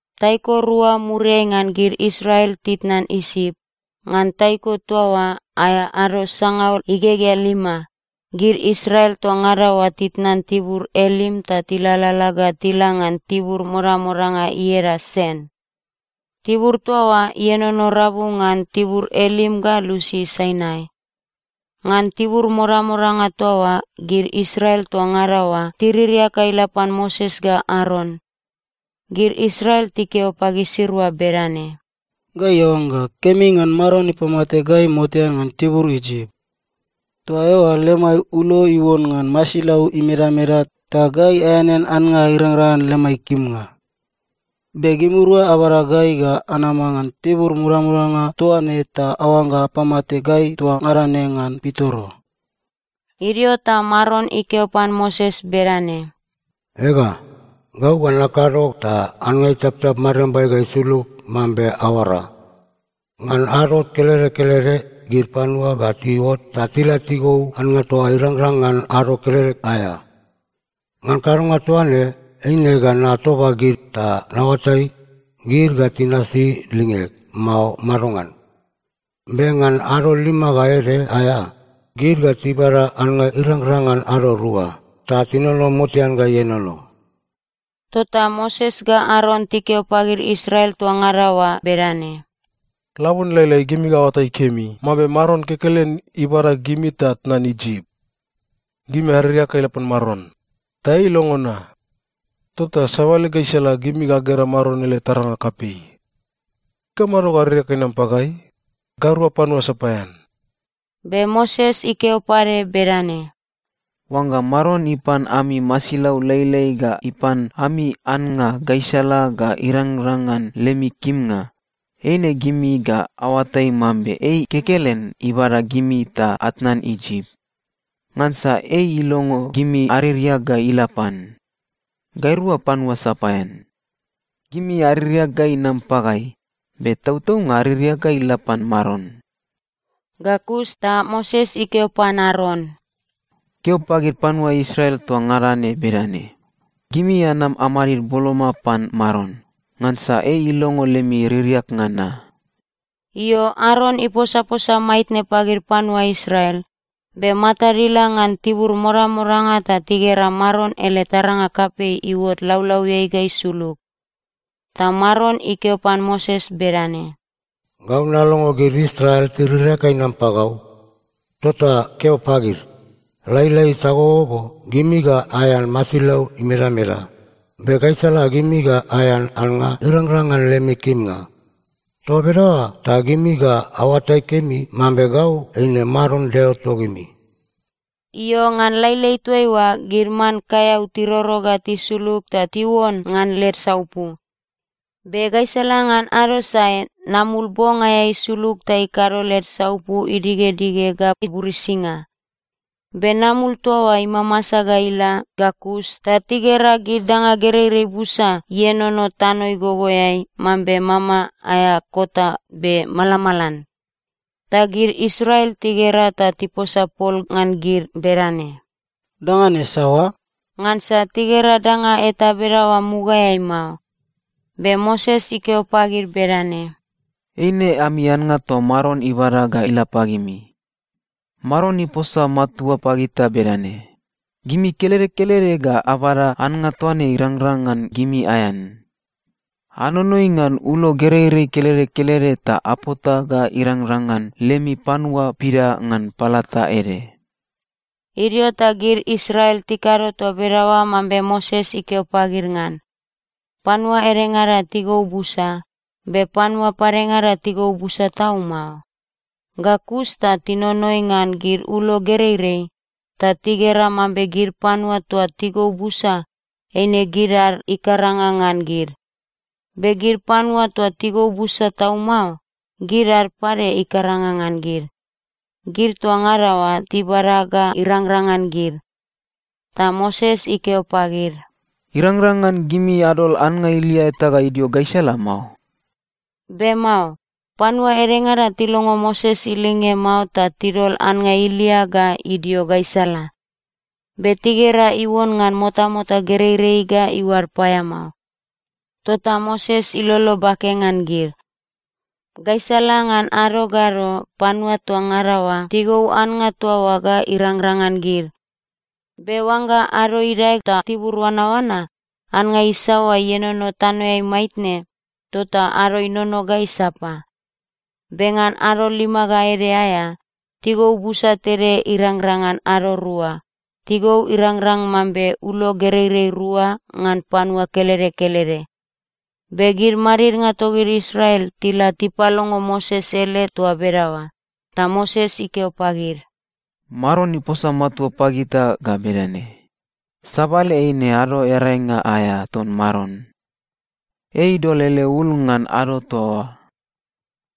Taiko rua muriai ngan gid Israel titnan Isip, ngan taiko toa oa aea ado sangaul igegea lima, gid Israel toa ngada oa titnan tibur Elim ta tilalala ga tila ngan tibur modamodanga ieda Sen. Tibur toa oa ienono rabu ngan tibur Elim ga lusi Sainai. Ngan tibur modamodanga toa oa gid Israel toa ngada oa tiririak ga ila pan Moses ga Aron. Gid Israel tikeo pagisirua bedane, “Gai aoangga kemi ngan Maron ipamate gai motean ngan tibur Isip. Toa eoa lemai ulo iuon ngan masilau imedameda ta gai aeanean annga irangrang ngan lemai kimnga. Be gimirua abada gai ga anama ngan tibur modamodanga toa ne ta aoangga apamate gai toa ngada ne ngan pitoro.” Idio ta Maron ikeo pan Moses bedane, “Ega, gau ga nakado ta annga itaptap mariambai ga isulug mambe aoara. Ngan ado kelede kelede gid panua ga tiuot ta tila tigou annga toa oa irangrang ngan ado kelede aea. Ngan kadonga toa ne, eine ga natoba gid ta naoatai, gid ga tinasi lingeg, mao madongan? Be ngan ado lima ga ede aea, gid ga tibada annga irangrang ngan ado rua, ta tinono motean ga ienono.” Tota Moses ga Aron tikeo pagid Israel toa ngada oa bedane, “Labone lailai gimi ga aoatai kemi mambe Maron kekelen ibada gimi ta atnan Isip. Gimi aririak ga ila pan Maron, ta ei ilongo na. Tota sabale gaisala gimi ga agera Maron ele taranga kapei. Ikamado ga aririak ga inam pagai? Gairua panua sapaean.” Be Moses ikeo pade bedane, “Oangga Maron ipan ami masilau lailai ga ipan ami annga gaisala ga irangrang ngan lemi kimnga, eine gimi ga aoatai mambe ei kekelen ibada gimi ta atnan Isip. Ngansa ei ilongo gimi aririak ga ila pan. Gairua panua sapaean. Gimi aririak ga inam pagai, be tautaunga aririak ga ila pan Maron.” Ga kus ta Moses ikeo pan Aron, “Keo pagid panua Israel toa ngada ne bedane, ‘Gimi anam amadid boloma pan Maron, ngansa ei ilongo lemi ririaknga na.’” Io, Aron iposaposa maitne pagid panua Israel, be matad ila ngan tibur modamodanga ta tigera Maron ele taranga kapei iuot laulauiai ga isulug. Ta Maron ikeo pan Moses bedane, “Gau nalongo gid Israel tiririak ga inam pagau. Tota keo pagid, ‘Lailai sagogogo gimi ga aean masilau imedameda, be gaisala gimi ga aean annga irangrang ngan lemi kimnga. Toa bedaoa ta gimi ga aoatai kemi mambe gau eine Maron Deo togimi.’” Io, ngan lailai toaiua gid man kaeau tiroro ga tisulug ta tiuon ngan led saupu. Be gaisala ngan ado sae, namul bong aea isulug ta ikado led saupu idigedige ga iburisinga. Be namul toa oa imamasa ga ila ga kus ta tigera gid danga gereirei busa ienono tano igogoeai mambe mama aea kota be malamalan. Ta gid Israel tigera ta tiposa pol ngan gid bedane, “Danga ne saoa?” Ngansa tigera danga eta bedaoa mugaeai mao. Be Moses ikeo pagid bedane, “Eine ami annga toa Maron ibada ga ila pagimi. Maron iposa matua pagita bedane, ‘Gimi kelede kelede ga abada annga toa ne irangrang ngan gimi aean. Anonoi ngan ulo gereirei kelede kelede ta apota ga irangrang ngan lemi panua pida ngan palata ede.’” Idio ta gid Israel tikado toa bedaoa mambe Moses ikeo pagid ngan. Panua edengada tigou busa, be panua padengada tigou busa tau mao. Ga kus ta tinonoi ngan gid ulo gereirei, ta tigera mambe gid panua toa tigou busa, eine gid ad ikaranga ngan gid, be gid panua toa tigou busa tau mao, gid ad pade ikaranga ngan gid. Gid toa ngada oa tibada ga irangrang ngan gid. Ta Moses ikeo pagid, “Irangrang ngan gimi adol annga ilia eta ga idio gaisala mao.” Be mao. Panua edengada tilongo Moses ilinge mao ta tidol annga ilia ga idio gaisala. Be tigera iuon ngan motamota gereirei ga iuad paeamao. Tota Moses ilolo bake ngan gid. Gaisala ngan ado ga ado, panua toa ngada oa tigou annga toa oa ga irangrang ngan gid. Be oangga ado idae ta tibur oanaoana, annga isaoa ienono tanoeai maitne, tota ado inono ga isapa. Be ngan ado lima ga ede aea, tigou busa tede irangrang ngan ado rua. Tigou irangrang mambe ulo gereirei rua ngan panua kelede kelede. Be gid madidnga togid Israel tila tipalongo Moses ele toa bedaoa. Ta Moses ikeo pagid, “Maron iposa matua pagita ga bedane, ‘Sabale eine Ado Earainga aea ton Maron. Ei idol ele ul ngan ado toa oa.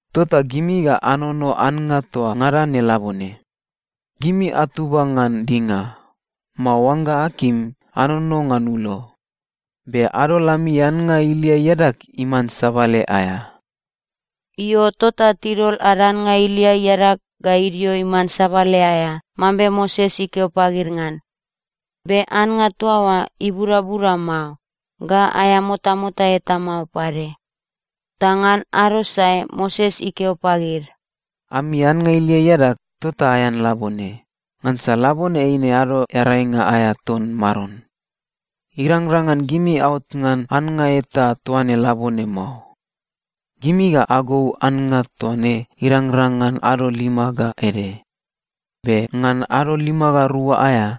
Tota gimi ga anono annga toa ngada ne labone. Gimi atuba ngan dinga, mao oangga akim, anono ngan ulo. Be adol ami annga ilia iadag iman sabale aea.’” Io, tota tidol ad annga ilia iadag ga idio iman sabale aea, mambe Moses ikeo pagid ngan. Be annga toa oa ibudabuda mao, ga aea motamota eta mao pade. Ta ngan ado sae Moses ikeo pagid, “Ami annga ilia iadag, tota aean labone. Ngansa labone eine Ado Earainga aea ton Maron. Irangrang ngan gimi aot ngan annga eta toa ne labone mao. Gimi ga agou annga toa ne irangrang ngan ado lima ga ede, be ngan ado lima ga rua aea,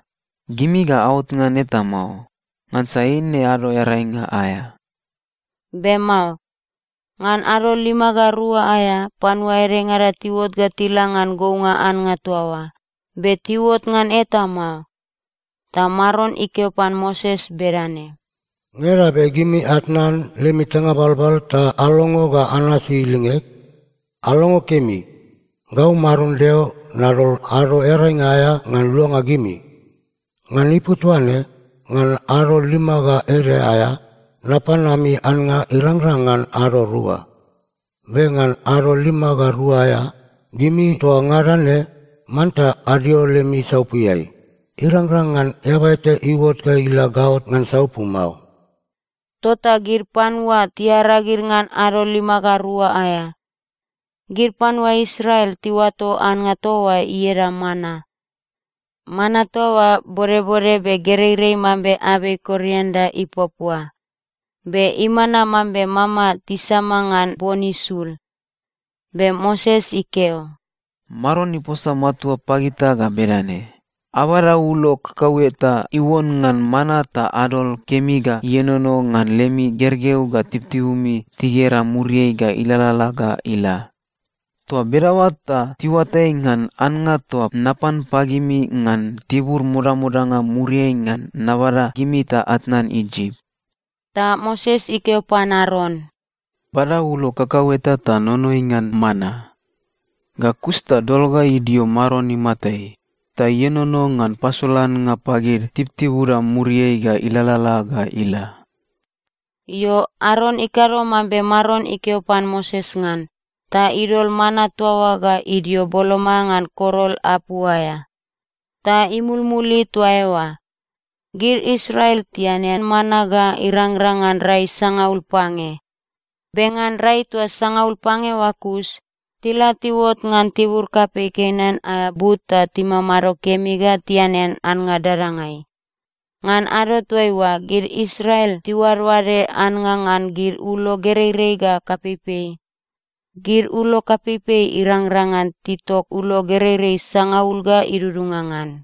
gimi ga aot ngan eta mao, ngansa eine Ado Earainga aea.” Be mao. Ngan ado lima ga rua aea, panua edengada tiuot ga tila ngan gounga annga toa oa, be tiuot ngan eta mao. Ta Maron ikeo pan Moses bedane, “Ngeda be gimi atnan lemi tanga balbal ta alongo ga anasi lingeg? Alongo kemi. Gau Maron Deo nadol Ado Earainga aea ngan luanga gimi. Ngan ipu toaine, ngan ado lima ga ede aea, napan ami annga irangrang ngan ado rua. Be ngan ado lima ga rua aea, gimi toa ngada ne manta adio lemi saupuiai. Irangrang ngan eaba eta iuot ga ila gaot ngan saupu mao.” Tota gid panua tiaragid ngan ado lima ga rua aea. Gid panua Israel tiuato annga toa oa ieda mana. Mana toa oa bodbode be gereirei mambe abei korianda ipuapua. Be imana mambe mama tisama ngan bon isul. Be Moses ikeo, “Maron iposa matua pagita ga bedane, ‘Abada ulo kakaueta iuon ngan mana ta adol kemi ga ienono ngan lemi gergeu ga tibutibumi tigera muriai ga ilalala ga ila. Toa bedaoa ta tiuatai ngan annga toa napan pagimi ngan tibur modamodanga muriai ngan nabada gimi ta atnan Isip.’” Ta Moses ikeo pan Aron, “Bada ulo kakaueta ta nonoi ngan mana. Ga kus ta dol ga idio Maron imatai, ta ienono ngan pasolannga pagid tibutibuda muriai ga ilalala ga ila.” Io, Aron ikado mambe Maron ikeo pan Moses ngan, ta idol mana toa oa ga idio boloma ngan korol apu aea, ta imulmuli toa eoa. Gid Israel tianean mana ga irangrang ngan rai sangaul pange. Be ngan rai toa sangaul pange oa kus, tila tiuot ngan tibur kapei Kenan aea but ta timamado kemi ga tianean annga dadangai. (Ngan ado toaiua, gid Israel tiuadoade annga ngan gid ulo gereirei ga kapeipei. Gid ulo kapeipei irangrang ngan titok ulo gereirei sangaul ga idudunga ngan.)